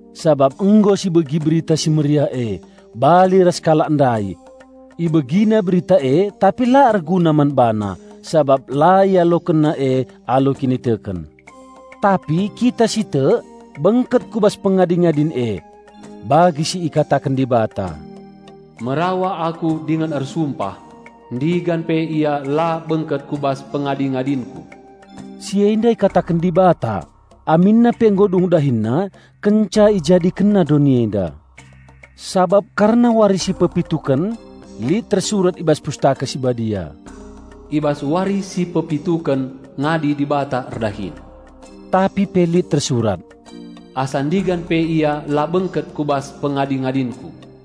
Sabap nggo sibegi Berita Si Mehuli e, bali ras kalak ndai. Ibegina berita e tapi la erguna man bana sabap la ialokenna e alu kiniteken. Tapi kita si tek, bengket ku bas pengadi-ngadin e. Bagi si ikataken Dibata, "Merawa Aku dingen Ersumpah 'Ndigan pe ia la bengket ku bas pengadi-ngadinKu!'" Si enda ikataken Dibata aminna pe nggo dung DahinNa kenca IjadikenNa doni enda. Sabap kerna wari si pepituken lit tersurat i bas Pustaka Si Badia, "I bas wari si pepituken ngadi Dibata erdahin." Tapi pe lit tersurat, "Asa ndigan pe ia la bengket ku bas pengadi-ngadinKu."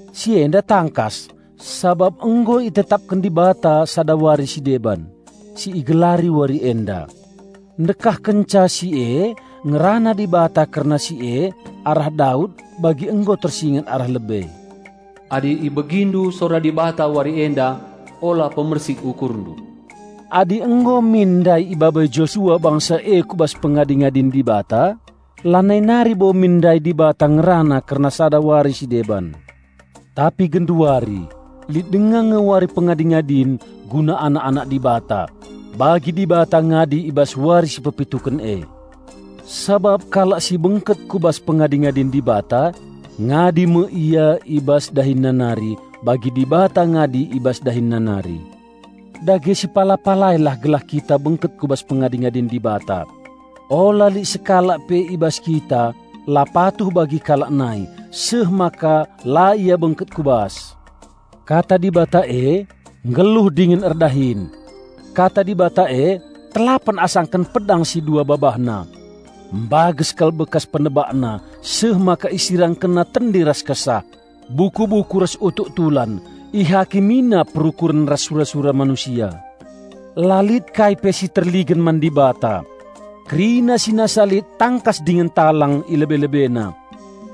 Si enda tangkas sabap nggo itetapken Dibata sada wari si deban, si igelari "wari enda". Ndekah kenca si e ngerana Dibata kerna si e arah Daud bagi nggo tersinget arah lebe, "Adi ibegindu sora Dibata wari enda, ula pemersik ukurndu." Adi nggo min ndai ibabai Josua bangsa e ku bas pengadi-ngadin Dibata, lanai nari bo min ndai Dibata ngerana kerna sada wari si deban. Tapi genduari lit denga nge wari pengadi-ngadin guna anak-anak Dibata, bagi Dibata ngadi i bas wari si pepituken e. Sabap kalak si bengket ku bas pengadi-ngadin Dibata, ngadi me ia i bas dahinna nari, bagi Dibata ngadi i bas DahinNa nari. Dage sipala-palailah gelah kita bengket ku bas pengadi-ngadin Dibata. Ula lit sekalak pe i bas kita la patuh bagi kalak nai, seh maka la ia bengket ku bas. Kata Dibata e nggeluh dingen erdahin. Kata Dibata e telapen asangken pedang si dua babahna. Mbages kal bekas penebakna seh maka isirangkenna tendi ras kesah, buku-buku ras utuk tulan. Ihakimina perukuren ras sura-sura manusia. La lit kai pe si terligen man Dibata. Kerina si nasa lit tangkas dingen talang i lebe-LebeNa.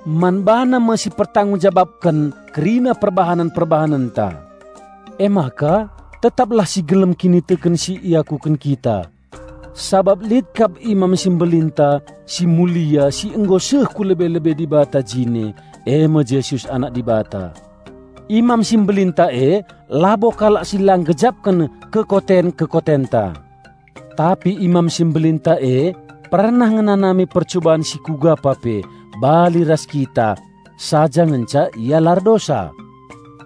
Man BaNa me sipertanggung jabapken kerina perbahanen-perbahanenta. Emaka tetaplah si gelem kiniteken si iakuken kita. Sabap lit kap Imam si Mbelinta si mulia si nggo seh ku lebe-lebe Dibata jine, e me Jesus Anak Dibata. Imam si Mbelinta e labo kalak si la nggejapken kekoten-kekotenta. Tapi Imam si Mbelinta e pernah ngenanami percuban si kuga pa pe, bali ras kita; saja ngenca Ia la erdosa!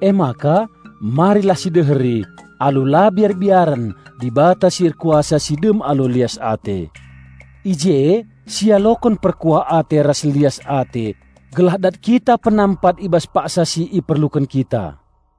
Emaka marilah sideheri alu la biar-biaren Dibata si erkuasa si dem alu lias ate. I je sialoken perkuah ate ras lias ate gelah dat kita penampat i bas paksa si iperluken kita.